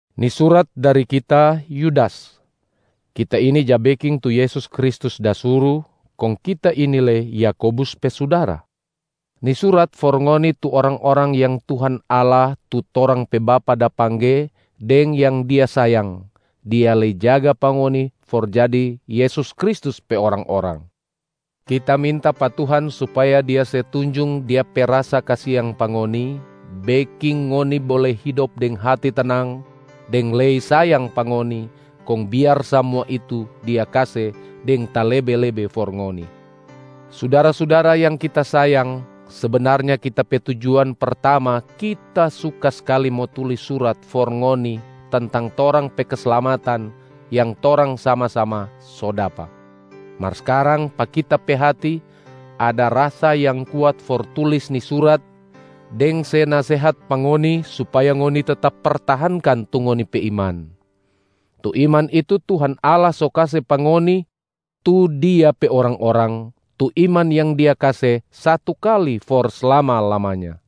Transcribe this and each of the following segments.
Ni surat dari kita, Yudas. Kita ini ja beking tu Yesus Kristus da suru, kong kita ini lei Yakobus pe sudara. Ni surat for ngoni tu orang-orang yang Tuhan Allah tu torang pe Bapa da pangge deng yang Dia sayang, Dia lei jaga pa ngoni for jadi Yesus Kristus pe orang-orang. Kita minta pa Tuhan supaya Dia se tunjung Dia pe rasa kasiang pa ngoni, beking ngoni bole hidop deng hati tenang, deng lei sayang pa ngoni, kong biar samua itu Dia kase deng talebe-lebe for ngoni. Sudara-sudara yang kita sayang, sebenarnya kita pe tujuan pertama kita suka skali mo tulis surat for ngoni tentang torang pe keslamatan yang torang sama-sama so dapa. Mar skarang pa kita pe hati ada rasa yang kuat for tulis ni surat deng se nasehat pa ngoni supaya ngoni tetap pertahankan tu ngoni pe iman. Tu iman itu Tuhan Allah so kase pa ngoni tu Dia pe orang-orang, tu iman yang Dia kase satu kali for slama-lamanya.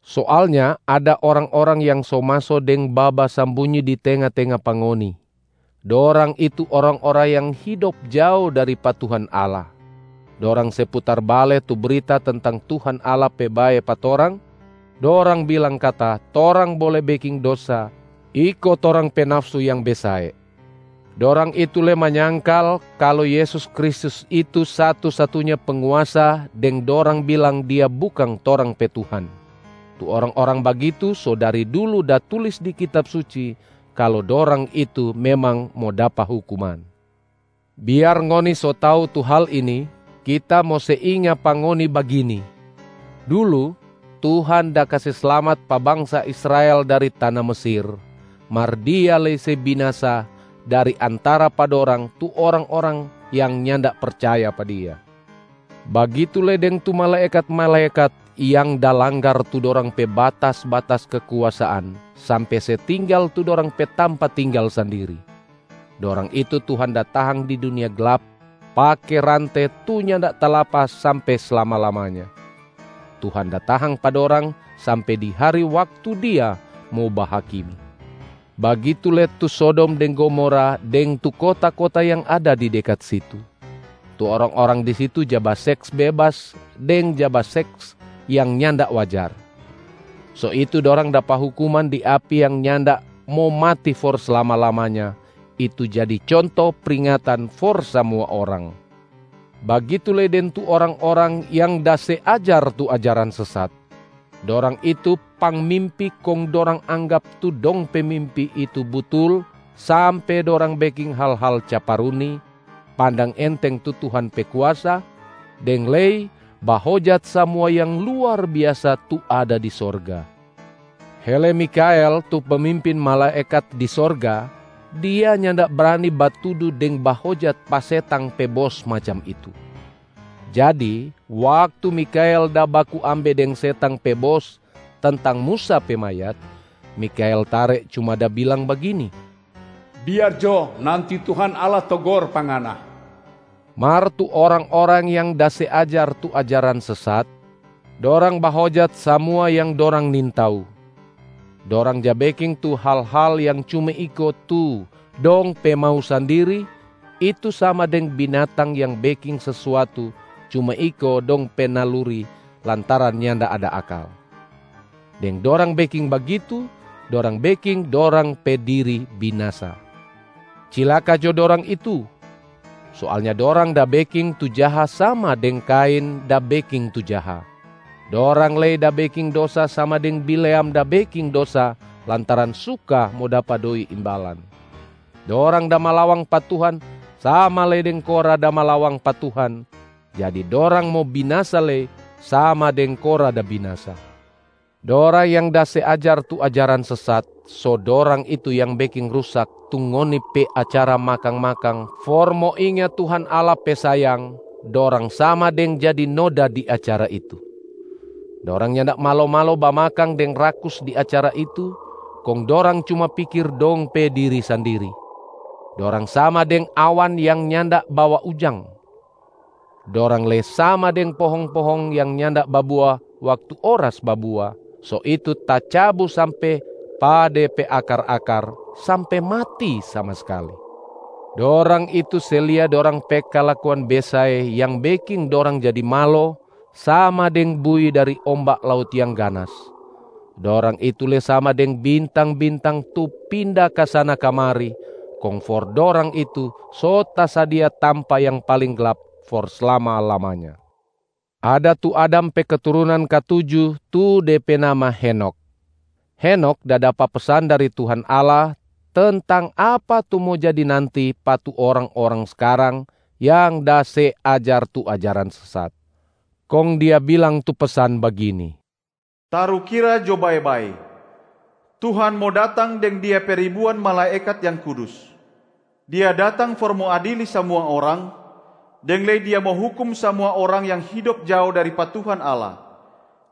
Soalnya ada orang-orang yang so maso deng babasambunyi di tenga-tenga pa ngoni. Dorang itu orang-orang yang hidop jao dari pa Tuhan Allah. Dorang se putar bale tu brita tentang Tuhan Allah pe bae pa torang, dorang bilang kata torang bole beking dosa iko torang pe nafsu yang besae. Dorang itu lei manyangkal kalu Yesus Kristus itu satu-satunya Penguasa deng dorang bilang Dia bukang torang pe Tuhan. Tu orang-orang bagitu so dari dulu da tulis di Kitab Suci kalu dorang itu memang mo dapa hukuman. Biar ngoni so tau tu hal ini, kita mo se inga pa ngoni bagini: dulu, Tuhan da kase slamat pa bangsa Israel dari tana Mesir, mar Dia lei se binasa dari antara pa dorang tu orang-orang yang nyanda percaya pa Dia. Bagitu lei deng tu malaekat-malaekat yang da langgar tu dorang pe batas-batas kekuasaan sampe se tinggal tu dorang pe tampa tinggal sandiri. Dorang itu Tuhan da tahang di dunia glap pake rante tu nyanda talapas sampe slama-lamanya. Tuhan da tahang pa dorang sampe di hari waktu Dia mo bahakimi. Bagitu lei tu Sodom deng Gomora deng tu kota-kota yang ada di dekat situ. Tu orang-orang di situ ja baseks bebas deng ja baseks yang nyanda wajar. So itu dorang dapa hukuman di api yang nyanda mo mati for slama-lamanya, itu jadi conto pringatan for samua orang. Bagitu lei deng tu orang-orang yang da se ajar tu ajaran sesat. Dorang itu pangmimpi kong dorang anggap tu dong pe mimpi itu butul sampe dorang beking hal-hal caparuni, pandang enteng tu Tuhan pe kuasa, deng lei bahojat samua yang luar biasa tu ada di sorga. Hele Mikhael tu pemimpin malaekat di sorga, dia nyanda brani batudu deng bahojat pa setang pe bos macam itu. Jadi waktu Mikhael da baku ambe deng setang pe bos tentang Musa pe mayat, Mikhael tare cuma da bilang bagini, “Biar jo nanti Tuhan Allah togor pa ngana!” Mar tu orang-orang yang da se ajar tu ajaran sesat, dorang bahojat samua yang dorang nintau. Dorang ja beking tu hal-hal yang cuma iko tu dong pe mau sandiri, itu sama deng binatang yang beking sesuatu cuma iko dong pe naluri lantaran nyanda ada akal. Deng dorang beking bagitu, dorang beking dorang pe diri binasa. Cilaka jo dorang itu! Soalnya dorang da beking tu jaha sama deng Kain da beking tu jaha. Dorang lei da beking dosa sama deng Bileam da beking dosa lantaran suka mo dapa doi imbalan. Dorang da malawang pa Tuhan sama lei deng Korah da malawang pa Tuhan, jadi dorang mo binasa lei sama deng Korah da binasa. Dorang yang da se ajar tu ajaran sesat, so dorang itu yang beking rusak tu ngoni pe acara makang-makang for mo inga Tuhan Allah pe sayang, dorang sama deng jadi noda di acara itu. Dorang nyanda malo-malo bamakang deng rakus di acara itu, kong dorang cuma pikir dong pe diri sandiri. Dorang sama deng awan yang nyanda bawa ujang. Dorang lei sama deng pohong-pohong yang nyanda babua waktu oras babua, so itu tacabu sampe pa de pe akar-akar, sampe mati sama skali. Dorang itu se lia dorang pe kalakuan besae yang beking dorang jadi malo, sama deng buih dari omba laut yang ganas. Dorang itu lei sama deng bintang-bintang tu pinda kasana-kamari, kong for dorang itu so tasadia tampa yang paling glap for slama-lamanya. Ada tu Adam pe keturunan katuju tu de pe nama Henokh. Henokh da dapa pesan dari Tuhan Allah tentang apa tu mo jadi nanti pa tu orang-orang skarang yang da se ajar tu ajaran sesat. Kong dia bilang tu pesan bagini, “Tarukira jo bae-bae, Tuhan mo datang deng Dia pe ribuan malaekat yang kudus. Dia datang for mo adili samua orang, deng lei Dia mo hukum samua orang yang hidop jao dari pa Tuhan Allah.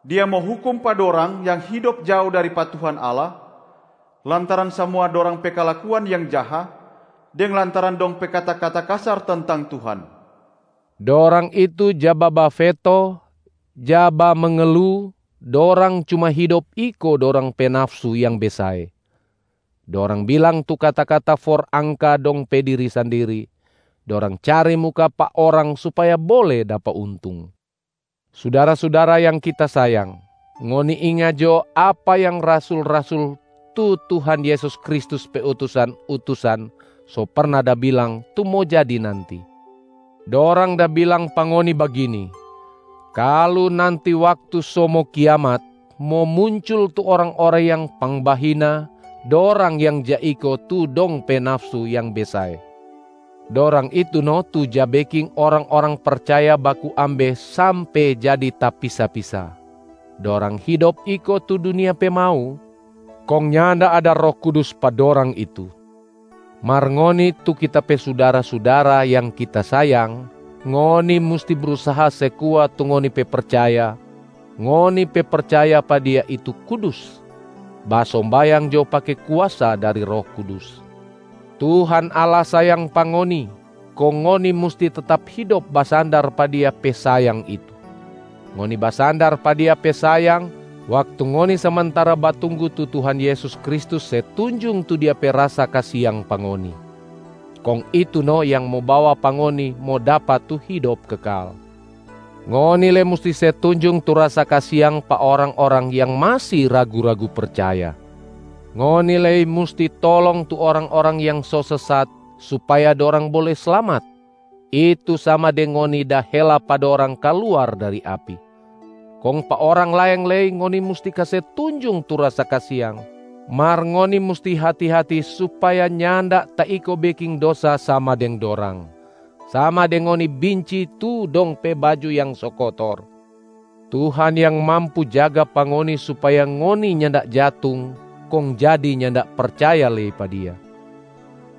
Dia mo hukum pa dorang yang hidop jao dari pa Tuhan Allah lantaran samua dorang pe kalakuan yang jaha, deng lantaran dong pe kata-kata kasar tentang Tuhan.” Dorang itu ja babafeto, ja bamengelu, dorang cuma hidop iko dorang pe nafsu yang besae. Dorang bilang tu kata-kata for angka dong pe diri sandiri, dorang cari muka pa orang supaya bole dapa untung. Sudara-sudara yang kita sayang, ngoni inga jo apa yang rasul-rasul tu Tuhan Yesus Kristus pe utusan-utusan so perna da bilang tu mo jadi nanti. Dorang da bilang pa ngoni bagini, “Kalu nanti waktu so mo kiamat, mo muncul tu orang-orang yang pangbahina, dorang yang ja iko tu dong pe nafsu yang besae.” Dorang itu no tu ja beking orang-orang percaya baku ambe sampe jadi tapisa-pisa. Dorang hidop iko tu dunia pe mau, kong nyanda ada Roh Kudus pa dorang itu. Mar ngoni tu kita pe sudara-sudara yang kita sayang, ngoni musti brusaha se kuat tu ngoni pe percaya, ngoni pe percaya pa Dia itu kudus. Basombayang jo pake kuasa dari Roh Kudus. Tuhan Allah sayang pa ngoni, kong ngoni musti tetap hidop basandar pa Dia pe sayang itu. Ngoni basandar pa Dia pe sayang waktu ngoni samantara batunggu tu Tuhan Yesus Kristus se tunjung tu Dia pe rasa kasiang pa ngoni, kong itu no yang mo bawa pa ngoni mo dapa tu hidop kekal. Ngoni lei musti se tunjung tu rasa kasiang pa orang-orang yang masi ragu-ragu percaya. Ngoni lei musti tolong tu orang-orang yang so sesat supaya dorang bole slamat, itu sama deng ngoni da hela pa dorang kaluar dari api. Kong pa orang laeng lei ngoni musti kase tunjung tu rasa kasiang, mar ngoni musti hati-hati supaya nyanda taiko beking dosa sama deng dorang, sama deng ngoni binci tu dong pe baju yang so kotor. Tuhan yang mampu jaga pa ngoni supaya ngoni nyanda jatung kong jadi nyanda percaya lei pa Dia.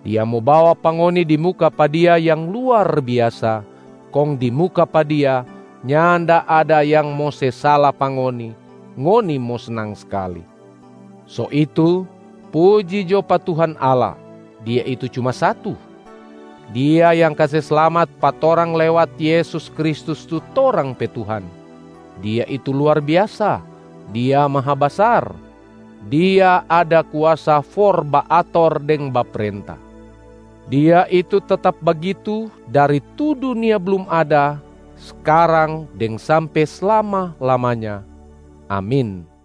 Dia mo bawa pa ngoni di muka pa Dia yang luar biasa, kong di muka pa Dia nyanda ada yang mo se sala pa ngoni, ngoni mo snang skali. So itu, puji jo pa Tuhan Allah, Dia itu cuma satu. Dia yang kase slamat pa torang lewat Yesus Kristus tu torang pe Tuhan. Dia itu luar biasa, Dia Mahabasar, Dia ada kuasa for baator deng baprenta. Dia itu tetap bagitu dari tu dunia blum ada, skarang deng sampe slama-lamanya. Amin.